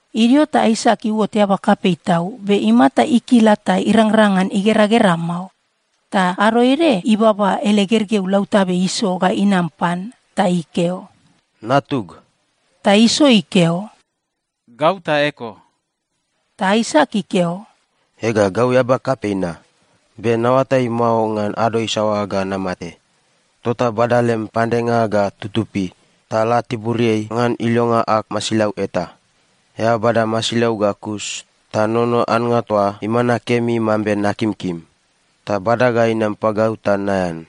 Idio ta Aisak iuot eaba kapei tau, be imata ikila ta irangrang ngan igeragera mao. Ta ado ede ibaba ele gergeu lautabe Iso ga inam pan. Ta ikeo, “Natug.” Ta Iso ikeo, “Gau ta eko.” Ta Aisak ikeo, “Ega, gau eaba kapei na, be naoatai mao ngan ado isaoa ga namate. Tota bada lem pandenga ga tutupi ta la tiburiai ngan ilonga ag masilau eta. Eao bada masilau ga kus ta nono annga toa imana kemi mambe nakimkim. Ta bada ga inam pagau ta naean.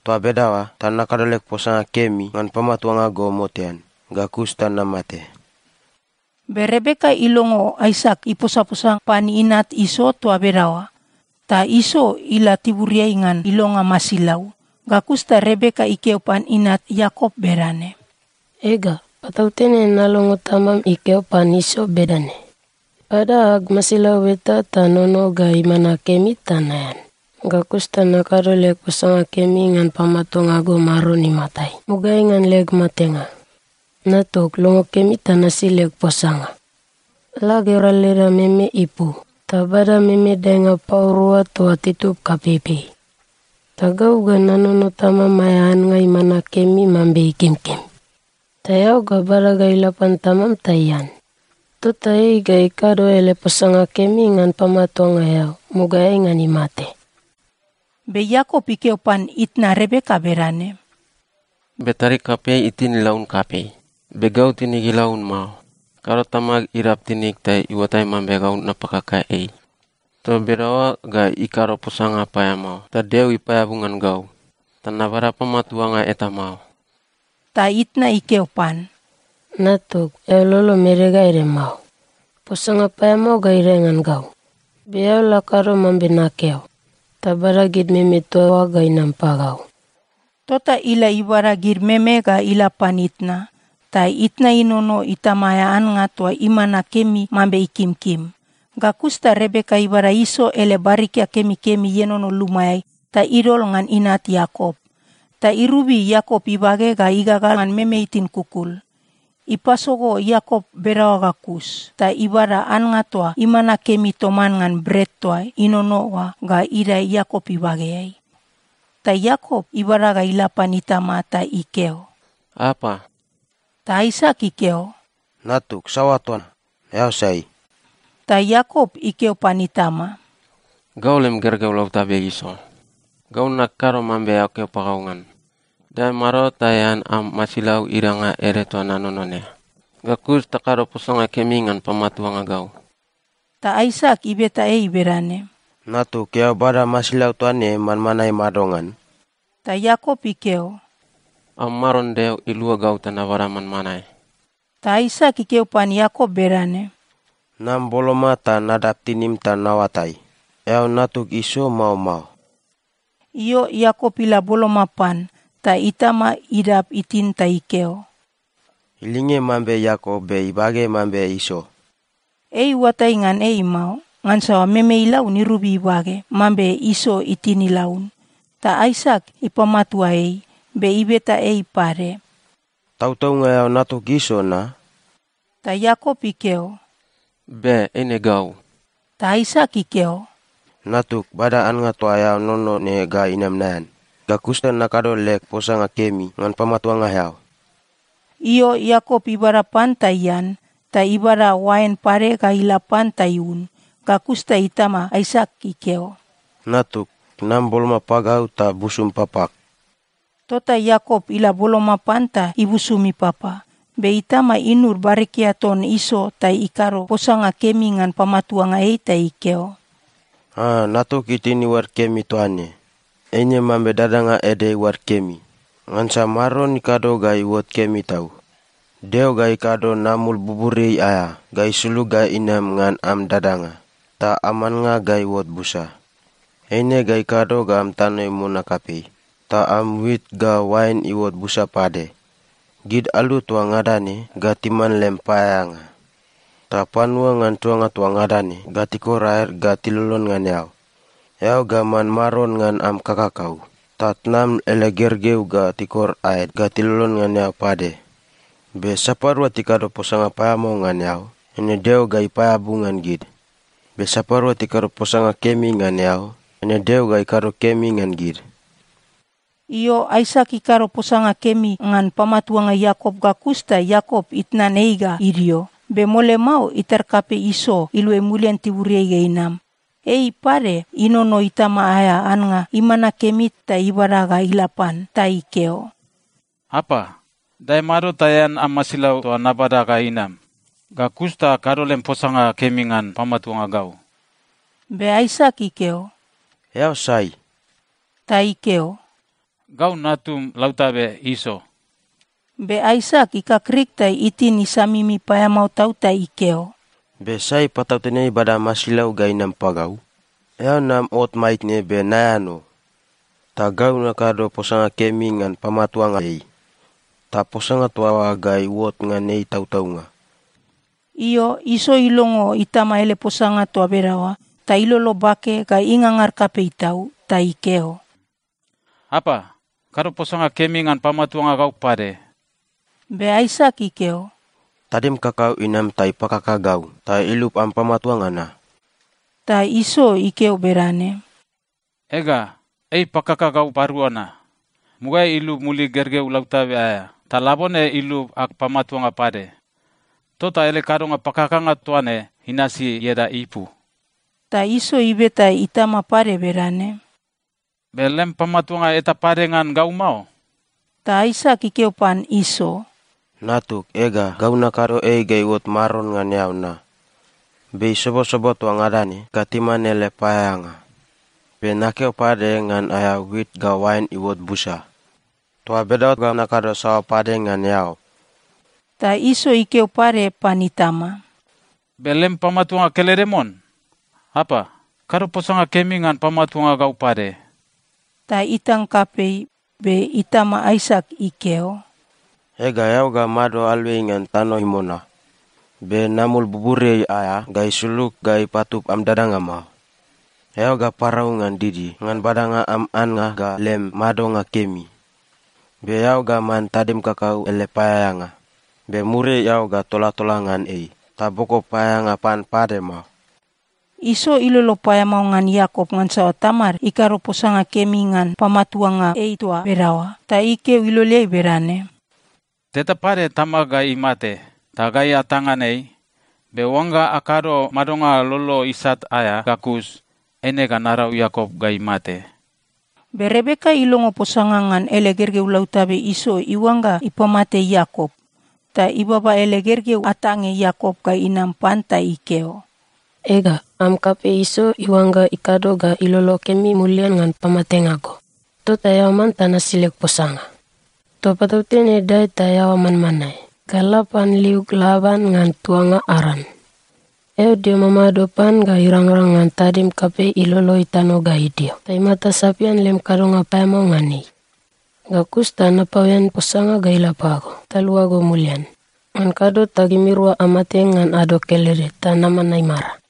Toa bedaoa ta nakado leg posanga kemi ngan pamatuanga go motean, ga kus ta namate.” Be Rebeka ilongo Aisak iposaposa pan inat Iso toa bedaoa. Ta Iso ila tiburiai ngan ilonga masilau. Ga kus ta Rebeka ikeo pan inat Iakop bedane, “Ega, patautene nalongo tamam ikeo pan Iso bedane, ‘Bada ag masilau eta ta nono ga imana kemi ta naean. Ga kus ta nakado leg posanga kemi ngan pamatuanga go Maron imatai, mugaeai ngan leg matenga.’ Natug, longo kemi ta nasi leg posanga. La gera leda meme ipu ta bada meme daenga pau rua toa titub kapeipei. Ta gau ga nanono tamam aea annga imana kemi mambe ikimkim. Ta eao ga bada ga ila pan tamam ta ian. Tota ei ga ikado ele posanga kemi ngan pamatuanga eao, mugaeai ngan imate.” Be Iakop ikeo pan itna Rebeka bedane, “Be tadig kapei itin ilaun kapei. Be gau tinig ilaun mao. Kado tamag idab tinig ta iuatai mambe napakaka ei. Toa bedaoa ga ikado posanga paeamao ta Deo ipaeabu ngan gau, ta nabada pamatuanga eta mao.” Ta itna ikeo pan, “Natug, eao lolom ede ga ede mao. Posanga paeamao ga idae ngan gau. Be eao la kado mambe nakeo, ta bada gid meme toa oa ga inam pagau.” Tota ila ibada gid meme ga ila pan itna. Ta itna inono itama aea annga toa imana kemi mambe ikimkim. Ga kus ta Rebeka ibada Iso ele barikia kemikemi ienono lumaeai ta idol ngan inat Iakop. Ta irobi Iakop ibage ga igagal ngan meme itin kukul. Ipasogo Iakop bedaoa ga kus ta ibada annga toa imana kemi toman ngan bret toa inono oa ga idae Iakop ibageai. Ta Iakop ibada ga ila pan itama ta ikeo, “Apa.” Ta Aisak ikeo, “Natug, saoa toa? Eao sai?” Ta Iakop ikeo pan itama, “Gau lem gergeu lautabe Iso. Gau nakado mambe eao keo pagau ngan. Dae mado ta ean am masilau idanga ede toa nanono ne. Ga kus ta kado posanga kemi ngan pamatuanga gau.” Ta Aisak ibeta ei bedane, “Natug, eao bada masilau toa ne manmanae madongan?” Ta Iakop ikeo, “Am Maron Deo ilua gau ta nabada manmanae.” Ta Aisak ikeo pan Iakop bedane, “Nam boloma ta nadab tinim ta naoatai, eao natug Iso, mao mao?” Io, Iakop ila boloma pan, ta itama idab itin ta ikeo, “Ilinge mambe Iakop, be ibage mambe Iso.” Ei iuatai ngan ei mao, ngansa meme ilaun irobi ibage, mambe Iso itin ilaun. Ta Aisak ipamatua ei. Be ibeta ei pade, “Tautaunga eao natug Iso na?” Ta Iakop ikeo, “Be. Eine gau.” Ta Aisak ikeo, “Natug, bada annga toa eao nono ne ga inam naean. Ga kus ta nakado leg posanga kemi ngan pamatuanga eao.” Io, Iakop ibada pan ta ian, ta ibada oain pade ga ila pan ta iun. Ga kus ta itama Aisak ikeo, “Natug, nam boloma pagau ta busum papag.” Tota Iakop ila boloma pan ta ibusum ipapa. Be itama inud barikia ton Iso ta ikado posanga kemi ngan pamatuanga ei ta ikeo, “A, natug itin iuad kemi toa ne, eine mambe dadanga ede iuad kemi, ngansa Maron ikado ga iuot kemi tau. Deo ga ikado namul buburiai aea ga isulug ga inam ngan am dadanga, ta am annga ga iuot busa. Eine ga ikado ga am tano imona kapei ta am wit ga oain iuot busa pade. Gid alu toa ngada ne ga timan lem paeaeanga, ta panua ngan tuanga toa ngada ne ga tikor aed ga tilolon ngan eao. Eao ga man maron ngan am kakakau, ta tnam ele gergeu ga tikor aed ga tilolon ngan eao pade. Be sapadua tikado posanga paeamao ngan eao, eine Deo ga ipaeabu ngan gid. Be sapadua tikado posanga kemi ngan eao, eine Deo ga ikado kemi ngan gid.” Io, Aisak ikado posanga kemi ngan pamatuanga Iakop ga kus ta Iakop itnan ei ga idio. Be mole mao, itar kapei Iso iluai mulian tiburiai ga inam. Ei pade inono itama aea annga imana kemi ta ibada ga ila pan. Ta ikeo, “Apa, dae mado ta ean am masilau toa nabada ga inam. Ga kus ta kado lem posanga kemi ngan pamatuanga gau.” Be Aisak ikeo, “Eao sai?” Ta ikeo, “Gau natum lautabe Iso.” Be Aisak ikakrik ta itin isamimi paeamao tau ta ikeo, “Be sai patautene ibada masilau ga inam pagau? Eao nam ot maitne, be naean o. Ta gau nakado posanga kemi ngan pamatuanga ei, ta posanga toa oa ga iuot ngan ei tautaunga.” Io, Iso ilongo itama ele posanga toa bedaoa, ta ilolo bake ga ingangar kapei tau. Ta ikeo, “Apa, kado posanga kemi ngan pamatuanga gau pade!” Be Aisak ikeo, “Tadim kakau inam ta ipakaka gau ta ilub am pamatuanga na.” Ta Iso ikeo bedane, “Ega, ei ipakaka gau parua na. Mugaeai ilub mulig gergeu lautabe aea, ta labone ilub ag pamatuanga pade. Tota ele kadonga pakakanga toa ne inasi ieda ipu.” Ta Iso ibeta itama pade bedane, “Be lem pamatuanga eta pade ngan gau mao?” Ta Aisak ikeo pan Iso, “Natug, ega, gau nakado ei ga iuot maron ngan eao na. Be isobosobo toa ngada ne ga timan ele paeaeanga. Be nakeo pade ngan aea wit ga oain iuot busa. Toa bedaoa ga nakado saoa pade ngan eao?” Ta Iso ikeo pade pan itama, “Be lem pamatuanga kelede mon? Apa, kado posanga kemi ngan pamatuanga gau pade!” Ta itang kapei. Be itama Aisak ikeo, “Ega, eao ga mado aluai ngan tano imona. Be namul buburiai aea ga isulug ga ipatub am dadanga mao. Eao ga parau ngan didi ngan badanga am annga ga lem madonga kemi. Be eao ga man tadim kakau ele paeaeanga. Be muriai eao ga tolatola ngan ei, ta boko paeaeanga pan pade mao.” Iso ilolo paeamao ngan Iakop ngansa tamad ikado posanga kemi ngan pamatuanga ei toa bedaoa. Ta ikeo iloleai bedane, “Teta pade tamag ga imate, ta gai atang ngan ei. Be oangga akado madonga lolo isat aea ga kus, eine ga narau Iakop ga imate.” Be Rebeka ilongo posanga ngan ele gergeu lautabe Iso iuangga ipamate Iakop, ta ibaba ele gergeu atange Iakop ga inam pan ta ikeo, “Ega, am kapei Iso iuangga ikado ga ilolo kemi mulian ngan pamatenga go. Tota eao manta nasi leg posanga. Toa patautene dae ta eaoa manmanae ga la pan liug Laban ngan tuanga Aran. Eao dio mamado pan ga irangrang ngan tadim kapei ilolo itano ga idio ta imata sapian lem kadonga paeamao ngan ei. Ga kus ta napaoen posanga ga ila pago, ta luago mulian. Ngan kado ta gimirua amate ngan ado kelede ta naman aimara.”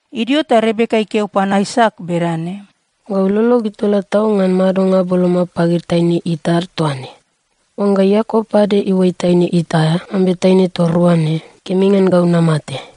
Idio ta Rebeka ikeo pan Aisak bedane, “Gau lolog itola tau ngan madonga boloma pagid taine It ad toa ne. Oangga Iakop pade iuai taine It aea, mambe taine toa rua ne, kemi ngan gau namate.”